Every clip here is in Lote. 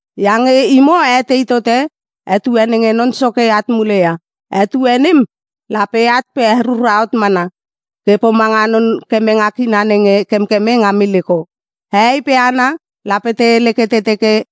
Iange imo a etei tote etue nenge Non Soke at mule ia. Etue nem lape at pe herura hot mana ke pomanga non kemenge kina nenge kemkeme nga miliko. Hehei pe hana lape te hele ke te teke,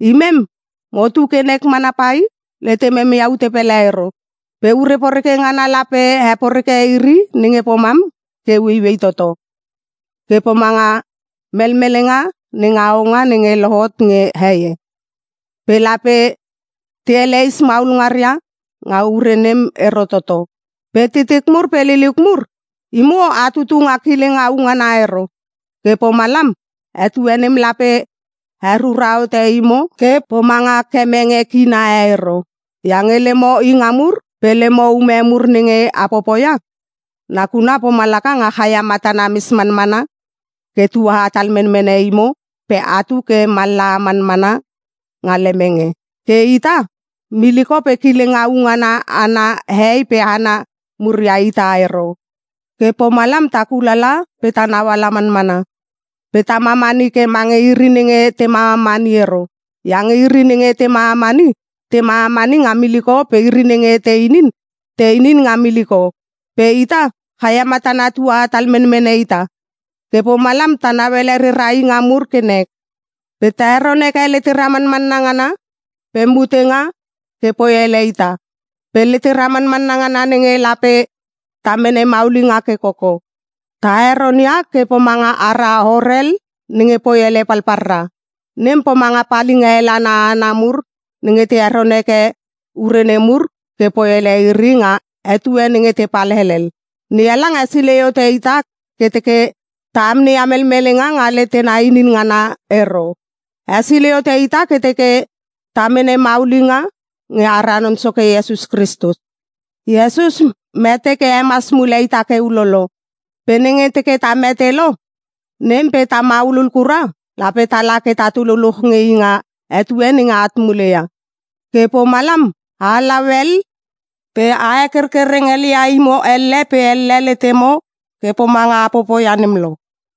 “Imem motu ke nek mana pai! Letemem ia ute pele ero!” Pe ure poreke ngana lape heporeke iri nenge pomam ke ueiuei toto, ke pomanga melmelenga nenga hohonga nenge lohot nge heie. Pe lape te eleis maul ngaria nga ure nem ero toto. Pe titik mur pe liliuk mur, imo a tutu nga kileng au ngana ero, ke pomalam etue nem lape herura hote imo ke pomanga kemenge kina e ero. Iange lemo inga mur pe lemo ume mur nenge a popoia, nakuna pomalaka nga chaia matana mes manmana ke tua hatal menmene imo pe atu ke mallaha manmana nga lemenge. Ke ita, miliko pe kileng au ngana ana hehei pe hana mur ia ita ero. Ke pomalam ta kulala pe ta nauala manmana, pe ta mamani ke mange iri nenge te mamamani ero. Iange iri nenge te mamamani, te mamamani nga miliko pe iri nenge te inin, te inin nga miliko. Pe ita, chaia matana tua hatal menmene ita. Ke pomalam ta nauele rera inga mur ke nek. Pe ta heron heke lete manmanna ngana pe mutenga ke poi ele ita. Pe letera manmanna ngana nenge lape ta mene maulinga ke koko, ta heronia ke pomanga ara horel nenge poi ele palpalra. Nem pomanga palinga hel ana hana mur nenge te heron heke ure nemur ke poi ele iri nga etue nenge tepal helel. NeHalang hesilei hote ita ke teke ta amneia melmelenga nga letena inin ngana ero. Hesilei hote ita ke teke ta mene maulinga nge ara Non Soke Iesus Kristus. Iesus mete ke hemas mule ita ke ulolo. Pe nenge teke ta mete lo, nem pe ta maulul kura, lape tala ke tatu luluch nge i nga etue nenge at mule ia. Ke pomalam a halau hel pe a hekerkereng helia imo elle pe elle letemo ke pomanga a popoia nem lo.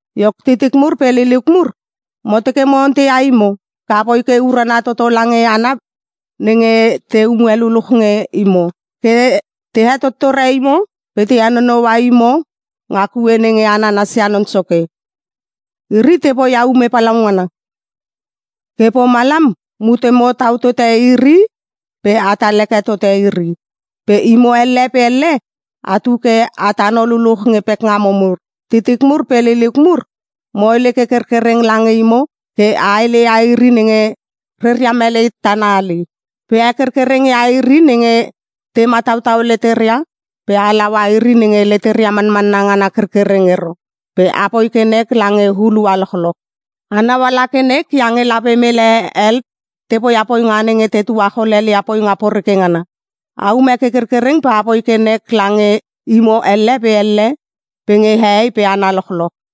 Iok titik mur pe liliuk mur, mo teke mo onteia imo ke apoi ke urana toto lange hana nenge teume luluch nge imo, ke te hetottore imo pe te henonoua imo nga kue nenge a nanasia Non Soke. Iri te poia ume palaungana, ke pomalam mutemo tau tote iri pe atal heke tote iri. Pe imo elle pe elle atu ke a tano luluch nge pekngamo mur. Titik mur pe liliuk mur, mo hele ke kerkereng lange imo ke a heleia iri nenge reria melei tana hali. Pe a hekerkereng ia iri nenge te matautau leteria pe a halaua iri nenge leteria manmanna ngana kerkereng ero pe apoi ke nek lange hulua lochloch. Anau ala ke nek iange lape mele hel te poia poinga nenge te tuachol helelia poinga poreke ngana. Aume ke kerkereng ke apoi ke nek lange imo elle pe elle pe nge hehei pe hana lochloch.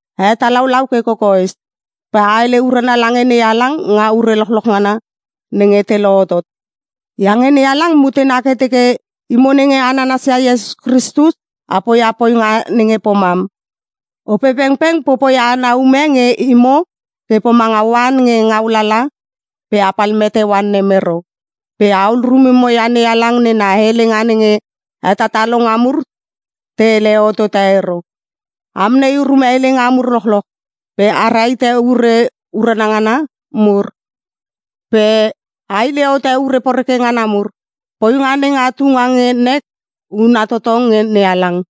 A hetalaulau ke kokoes, pe a hele urana lange NeHalang nga ure lochloch ngana nenge te lohotot, iange NeHalang mutena ke teke imo nenge a nanasia Iesus Kristus a poia poinga nenge pomam. Opepengpeng popoia ana ume nge imo ke pomanga oan nge ngau lalala pe apal mete oan nem ero. Pe ahul rumemo ia NeHalang nena helenga nenge hetatalonga mur te hele hotote ero. A amnei urume helenga mur lochloch pe a rahite ure urana ngana mur pe a hile hote ure poreke ngana mur. Poinga nenga tunga nge nek huna toto nge NeHalang,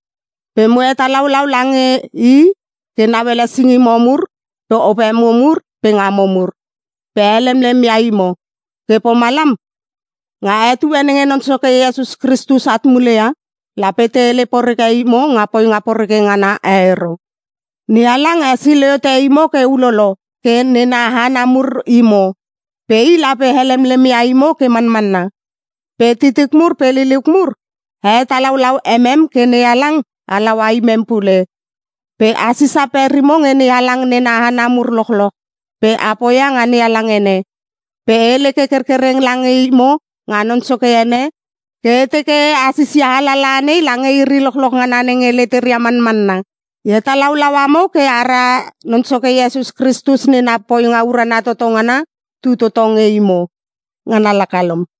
pe mo hetalaulau lange i ke nauele singimo mur pe opemo mur pe ngamo mur, pe helemlem ia imo. Ke pomalam, nga etue nenge Non Soke Iesus Kristus at mule ia, lape te hele poreke imo nga poinga poreke ngana e ero. NeHalang hesilei hote imo ke ulolo ke nena hana mur imo. Pe i lape helemlem ia imo ke manmanna. Pe titik mur pe liliuk mur, a hetalaulau emem ke NeHalang halaua imem pule. Pe a sisa perimo nge NeHalang nena hana mur lochloch pe a poia nga NeHalang ene. Pe e hele ke kerkereng lange imo nga Non Soke ene ke e teke a sisia alalaha nei lange iri lochloch ngana nenge leteria manmanna. E hetalaulau amo ke ara Non Soke Iesus Kristus nena poinga urana toto ngana tu toto nge imo. Ngana laka lom.